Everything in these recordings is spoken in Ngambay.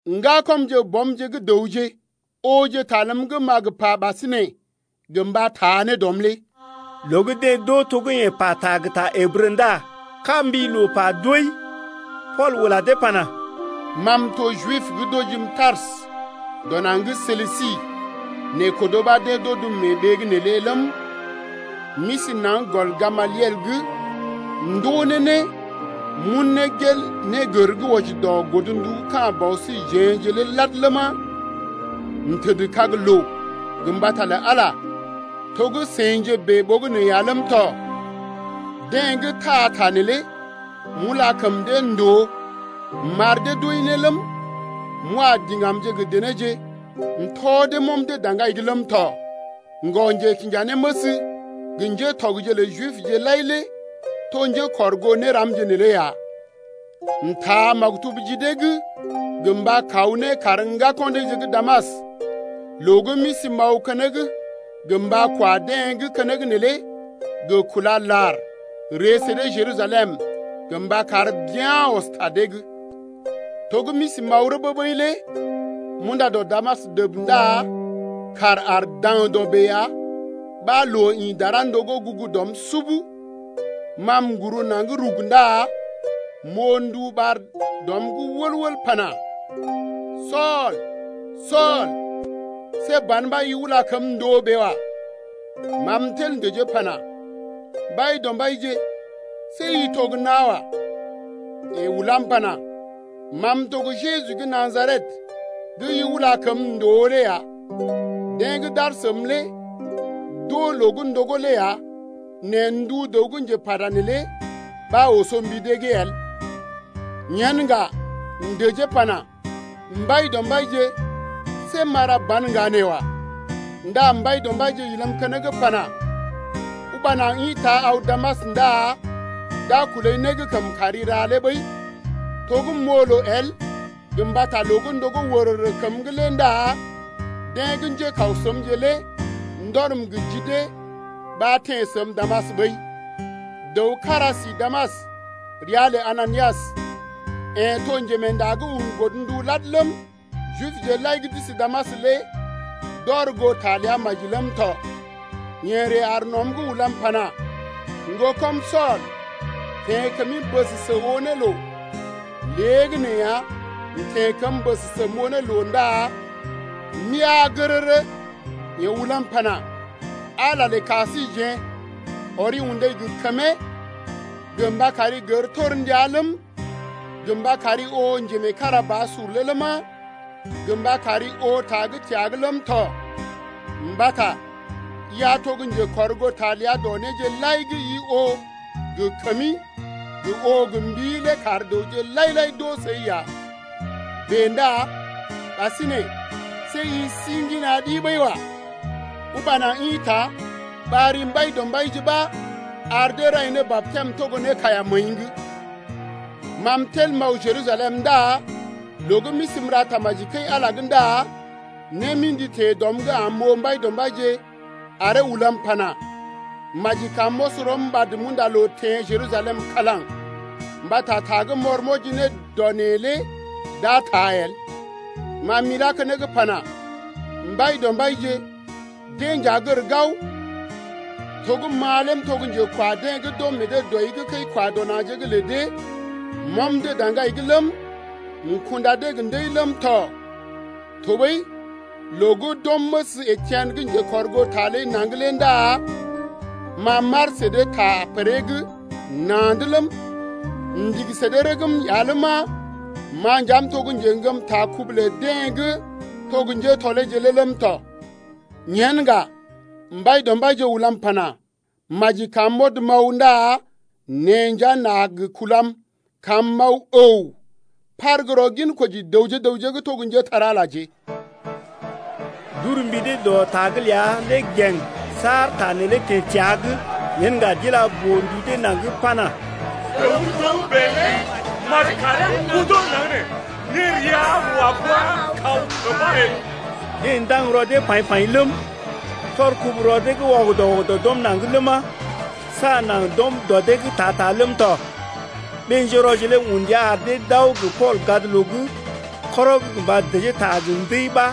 Ŋgakɔmje gə bɔmje gə́ dəwje, ooje ta ləm gə́ m’a gə pa ɓasinè gə mba taa ne dɔm lé. Loo gə́ deḛ d’oo to gə́ yeḛ pata gə ta Ǝbrə ndá kaa-mbi-loo-pa-doi. Pool ula dee pana: Ma m’to Jib gə́ d’ojim Tarsə dɔ naŋg gə́ Silisi nɛ kodo ɓa deḛ d’odəm mee ɓee’g neelé ləm, m’isi naŋg gɔl Gamaliel’g m’ndoo ne né m’un ne gel négər gə́ wɔji dɔ godndu ka̰ bɔ síje-je lé lad ləma, m’tədkag loo gə mbata lə Ala lé to gə́ seḭje bèe ɓogənè ya ləm tɔ. Deḛ gə́ taa ta neelé m’ula kəm dee ndòo m’ar dee d’wəi ne ləm, m’wa diŋgamje gə denéje m’tɔ dee m’ɔm dee daŋgai’g ləm tɔ. Ŋgɔ-njekinjanéməs gə ŋgatɔgje lə Jibje lai lé to njékɔrgoo néramje neelé ya. M’taa maktub ji dee’g gə mba kaw ne kar ŋgako̰ deeje gə́ Damas loo gə́ m’isi m’aw keneŋ gə mba kwa deḛ gə́ keneŋ neelé gə kúla lar ree sə dee Jerusalem gə mba kar bea̰ ɔs ta dee’g. To gə́ m’isi m’aw rəbee ɓəi lé m’unda dɔ Damas dəb ndá kàr aar daŋdɔ bèe ya ɓa loo ḭ dara ndogó gugu dɔm sub. Ma m’guru naŋg rug ndá m’oo ndu ɓar dɔm’g wəl-wəl pana: Sool, Sool, see ban ɓa i ula kəm ndòo bèe wa. Ma m’tel m’dəjee m’pana: Mbaidɔmbaije, see i to gə́ nawa. Yeḛ ulam pana: Ma m’to gə́ Jeju gə́ Najaret gə́ i ula kəm ndòo lé ya. Deḛ gə́ d’aar səm lé d’oo loo gə́ ndogó lé ya, nɛ ndu dəw gə́ njepata neelé ɓa oso mbi dee’g el. Yen ŋga m’dəjee m’pana: Mbaidɔmbaije, see m’a ra ban ŋga nee wa. Ndá Mbaidɔmbaije ilam keneŋ pana: Uba naŋg ḭta aw Damas ndá d’a kulai né gə́ kəm kari ra lé ɓəi. To gə́ m’oo loo el gə mbata loo gə́ ndogó wərərə kəm’g lé ndá deḛ gə́ njékaw səmje lé ndɔrm gə ji dee ɓa m’teḛ Damas ɓəi. Dəw kára si Damas ria lə Ananias, yeḛ to njemeenda gə́ un godndu lad ləm, Jibje lai gə́ d’isi Damas lé d’ɔr goo ta ləa maji ləm tɔ. Yeḛ ree aar nɔm’g ulam pana: Ŋgokɔm Sool, teḛ kəmi bəsəsə oo ne loo. Léegəneeya m’teḛ kəm bəsəsə m’oo ne loo ndá m’eaa gərərə. Yeḛ ulam pana: Ala lə ka síjeḛ ɔri undai gə kəmee gə mba kari gər torndia ləm, gə mba kari oo Njemeekarabasur lé ləma, gə mba kari oo ta gə́ təa’g ləm tɔ. Mbata i a to gə́ njekɔrgoota ləa dɔ néje lai gə́ i oo gə kəmi gə oo gə mbii lé kar dəwje lai-lai d’oo səi ya. Bèe ndá ɓasinè see i si ŋgina ɗi ɓəi wa. Uba naŋg ḭta ɓar ri Mbaidɔmbaije ɓa ar dee rai ne batɛm togo ne kaiya məəi’g. Ma m’tel m’aw Jerusalem ndá loo gə́ m’isi m’ra tamaji kəi-Ala’g ndá né mḭdi teḛ dɔm’g am m’oo Mbaidɔmbaije aree ulam pana: Maji kam m’ɔs rɔm ɓad m’unda loo m’teḛ Jerusalem kalaŋ mbata ta gə́ m’ɔr m’wɔji ne dɔ neḛ’g lé d’a taa el. Ma m’ilá keneŋ m’pana: Mbaidɔmbaije, deḛ nja gər gao, to gə́ ma lé m’to gə́ njekwa deḛ gə́ d’ɔm meḛ dee dɔi’g kəi-kwa-dɔ-na̰je’g lə dee, m’ɔm dee daŋgai’g ləm, m’kunda dee gə́ ndəi ləm tɔ. Tɔɓəi loo gə́ d’ɔm məs Etien gə́ njekɔrgoota ləi naŋg lé ndá ma m’aar sə dee ta pəree’g na̰’d ləm, m’ndigi sə dee rəgm ya ləma, ma nja m’to gə́ njeŋgəm ta kubu lə deḛ gə́ to gə́ njétɔleeje lé ləm tɔ. Yen ŋga Mbaidɔmbaije ulam pana: Maji kam m’ɔd m’aw ndá neḛ nja n’a gə kulam kam m’aw əw par gə́ rɔ ginkoji dəwje gə raŋg gə́ to njépole-magəje ya. D’ur mbi dee dɔ ta’g ləa lé gèŋ saar ta neelé teḛ təa’g. Yen ŋga d’ila boo-ndu dee naŋg pana: Dəw gə́ togə́bè lé maji karee godo naŋg nee. Nérea wa bua kaw kəmba el. Deḛ ndaŋg rɔ dee paḭ-paḭ ləm, tɔr kubu rɔ dee’g wɔgədɔ-wɔgədɔ d’ɔm naŋg ləma, saa naŋg d’ɔm dɔ dee’g ta-ta ləm tɔ. Ɓé-njérɔje lé un ndia ar dee d’aw gə Pool gadloo’g kɔrɔg mba dəjee ta gə ndəi ɓa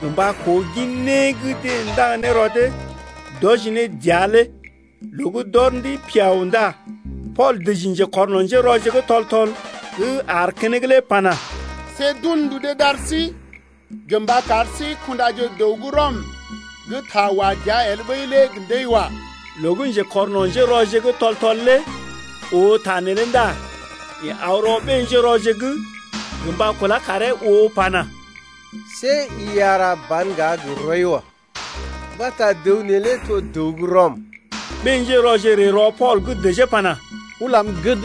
gə mba koo gin né gə́ deḛ ndaŋg ne rɔ dee d’wɔji ne dəa lé. Loo gə́ d’ɔr ndəi piao ndá Pool dəji njekɔrno̰ njérɔje gə́ tɔl-tɔl gə́ aar keneŋ lé pana: See d’un ndu dee d’ar sí gə mba kar sí kundaje dəw gə́ Rɔm gə́ ta wa dəa el ɓəi lé gə ndəi wa. Loo gə́ njekɔrno̰-njérɔje gə́ tɔl-tɔl lé oo ta neelé ndá yeḛ aw rɔ ɓé-njérɔje’g gə mba kulá karee oo pana: See i a ra ban ŋga gə rɔi wa. Mbata dəw neelé to dəw gə́ Rɔm. Ɓé-njérɔje ree rɔ Pool’g dəjee pana: Ulam gəd,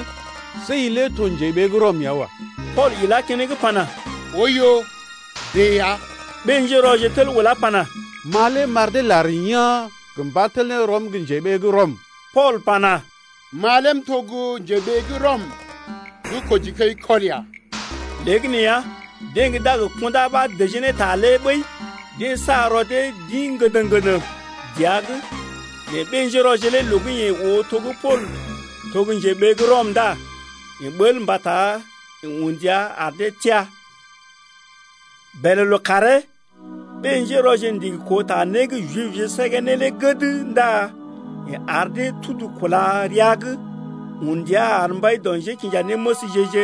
see i lé to njeɓee gə́ Rɔm ya wa. Pool ilá keneŋ pana: Oiyo, bèe ya. Ɓé-njérɔje tel ulá pana: Ma lé m’ar dee lar yaa̰ gə mba tel ne rɔm gə́ njeɓee gə́ Rɔm. Pool pana: Ma lé m’to gə́ njeɓee gə́ Rɔm gə́ kojikəikɔl ya. Léegəneeya deḛ gə́ d’a gə kundá ɓa dəjee ne ta lé ɓəi deḛ sa rɔ dee d’ḭ ŋgəndəŋ-ŋgəndəŋ dəa’g, nɛ ɓé-njérɔje lé loo gə́ yeḛ oo to gə́ Pool to gə́ njeɓee gə́ Rɔm ndá yeḛ ɓəl mbata yeḛ un ndia ar dee teá. Bèlè lookàree ɓé-njérɔje ndigi koo ta né gə́ Jibje səgee ne lé gəd ndá yeḛ ar dee tudu kúla rəa’g un ndia ar mbai dɔ njékinjanéməsje-je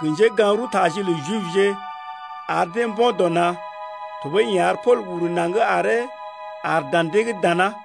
gə njégaŋ-rəwtaje lə Jibje ar dee mbo̰ dɔ na̰. Tɔɓəi yeḛ ar Pool uru naŋg aree aar dan dee’g dana.